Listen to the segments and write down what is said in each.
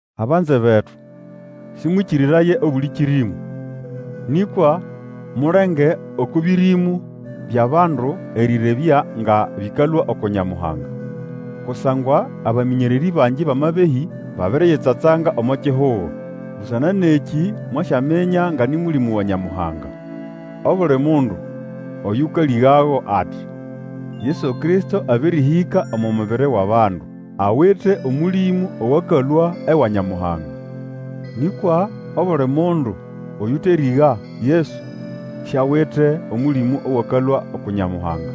Abanze betu, sĩmwĩkĩrĩraye obuli kĩrĩmũ, nĩkwa mulenge oko bĩrĩmũ byʼabandu erĩrebya nga bĩkalũa uku Nyamuhanga; kusangwa abamĩnyererĩ bangi bʼamabehĩ babiriyitsatsanga omo kihugo. Busana nʼekĩ mwasyaminya nga nĩ Mũlĩmũ wa Nyamuhanga: obuli mundu oyũkalĩgago ati, Yesu Kristo abĩrĩhĩka omo mubiri wʼabandu, awite Omũlĩmũ owakalũa ewa Nyamuhanga. Nĩkwa obuli mundu oyũterĩga Yesu siawite Omũlĩmũ owakalũa uku Nyamuhanga.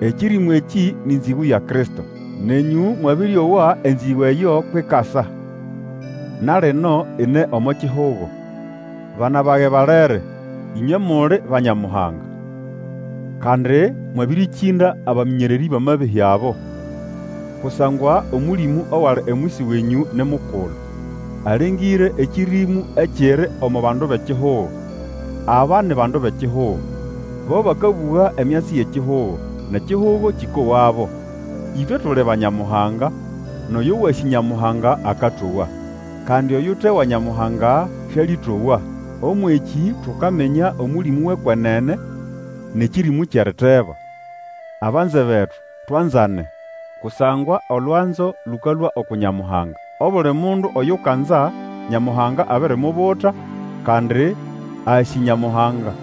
Ekĩrĩmũ ekĩ nĩ nzĩgũ ya Kristo. Nenyũ mwabĩrĩowa enzĩgũ eyo kwʼikasa, na lino ine omo kihugo. Bana bage balere, ĩnywe muli ba Nyamuhanga, kandi mwabĩrĩkĩnda abamĩnyererĩ bʼamabehĩ abo. Kusangwa Omũlĩmũ owali omwisi wenyũ ni mukulu, alengĩre ekĩrĩmũ ekiri omo bandu bʼekihugo. Aba ni bandu bʼekihugo, bo bakabũga emyatsi yʼekihugo, nʼekihugo kĩkowabo. Ĩtwe tuli ba Nyamuhanga, nʼoyo wasĩ Nyamuhanga akatowa. Kandi oyute wa Nyamuhanga sĩalĩtowa. Ũmwʼekĩ tukaminya Omũlĩmũ wʼekwenene, nʼekĩrĩmũ kyʼeriteba. Abanze betu, twanzane, kusangwa olwanzo lũkalũa uku Nyamuhanga. Obuli mundu Oyukanza, Nyamuhanga abirimubuta, kandi asĩ Nyamuhanga.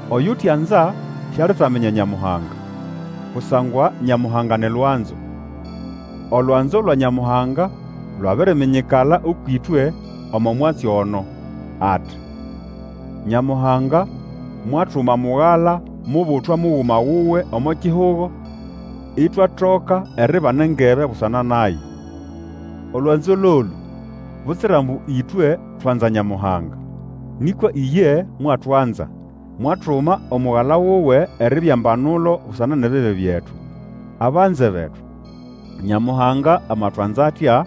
Oyutianza sialitaminya Nyamuhanga, kusangwa Nyamuhanga ni Lwanzo. Olwanzo lwa Nyamuhanga lwabiriminyikala ũkwʼĩtwe omo mwatsi ono, ati, Nyamuhanga mwatuma Mugala mubutwa muguma wuwe omo kihugo, itwatoka eribana engebe busana naye. Olwanzo lolũ; butsira ambu ĩtwe twanza Nyamuhanga, nĩkwa iye mwatwanza, mwatuma Omugala wuwe eribya mbanulo busana nʼebibi byetu. Abanze betu, Nyamuhanga amatwanza atya,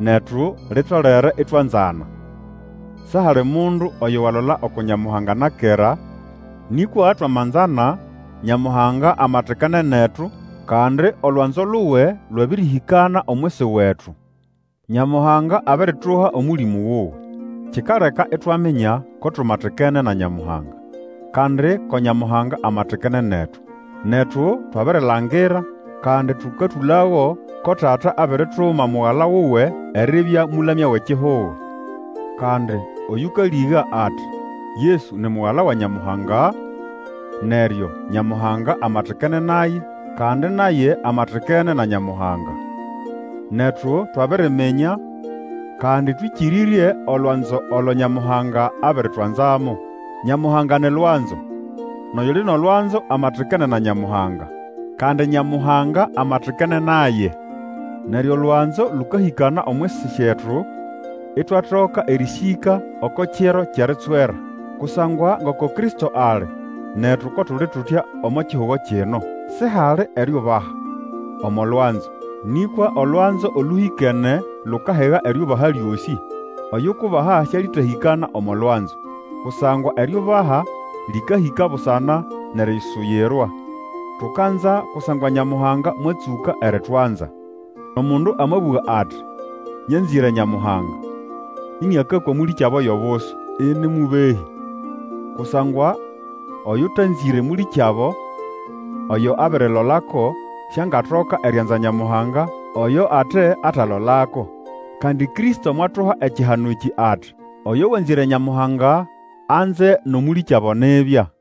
netu litolere itwanzana. Sihali mundu oyo walola uku Nyamuhanga na kera, nĩkwa twamanzana, Nyamuhanga amatikene netu, kandi olwanzo luwe lwabĩrĩhĩkana omwisi wetu. Nyamuhanga abirituha Omũlĩmũ wuwe, kikaleka itwaminya ko tumatikene na Nyamuhanga, kandi ko Nyamuhanga amatikene netu. Netu twabirilangira, kandi tũkatũlago ko Tata abirituma Mugala wuwe eribya Mũlamya wʼekihugo. Kandi oyũkalĩga ati, Yesu ni Mugala wa Nyamuhanga, neryo Nyamuhanga amatikene naye, kandi naye amatikene na Nyamuhanga. Netu twabiriminya, kandi twĩkĩrĩrye olwanzo olo Nyamuhanga abiritwanzamo. Nyamuhanga ni lwanzo, nʼoyuli nʼolwanzo amatikene na Nyamuhanga, kandi Nyamuhanga amatikene naye. Neryo olwanzo lũkahĩkana omwisi syetu, itwatoka erĩsĩka oko Kiro kyʼeritswerwa. Kusangwa ngoko Kristo ali, netu ko tuli tutya omo kihugo kino. Sihali eriubaha omo lwanzo; nĩkwa olwanzo olũhĩkene lukahiga eriubaha lyosĩ. Oyukubaha syalĩtahĩkana omo lwanzo, kusangwa eriubaha lĩkahĩka busana nʼerisuyirwa. Tukanza, kusangwa Nyamuhanga mwatsũka eritwanza. Omundu amabũga ati, Nyanzĩre Nyamuhanga, ĩnĩakakwa mũlĩkyabo yʼobusu ini mũbehĩ. Kusangwa Oyũtanzĩre mũlĩkyabo oyo abirilolako, siangatoka erianza Nyamuhanga oyo ate atalolako. Kandi Kristo mwatuha ekihano ekĩ ati, Oyo wanzĩre Nyamuhanga, anze nʼomũlĩkyabo nibya.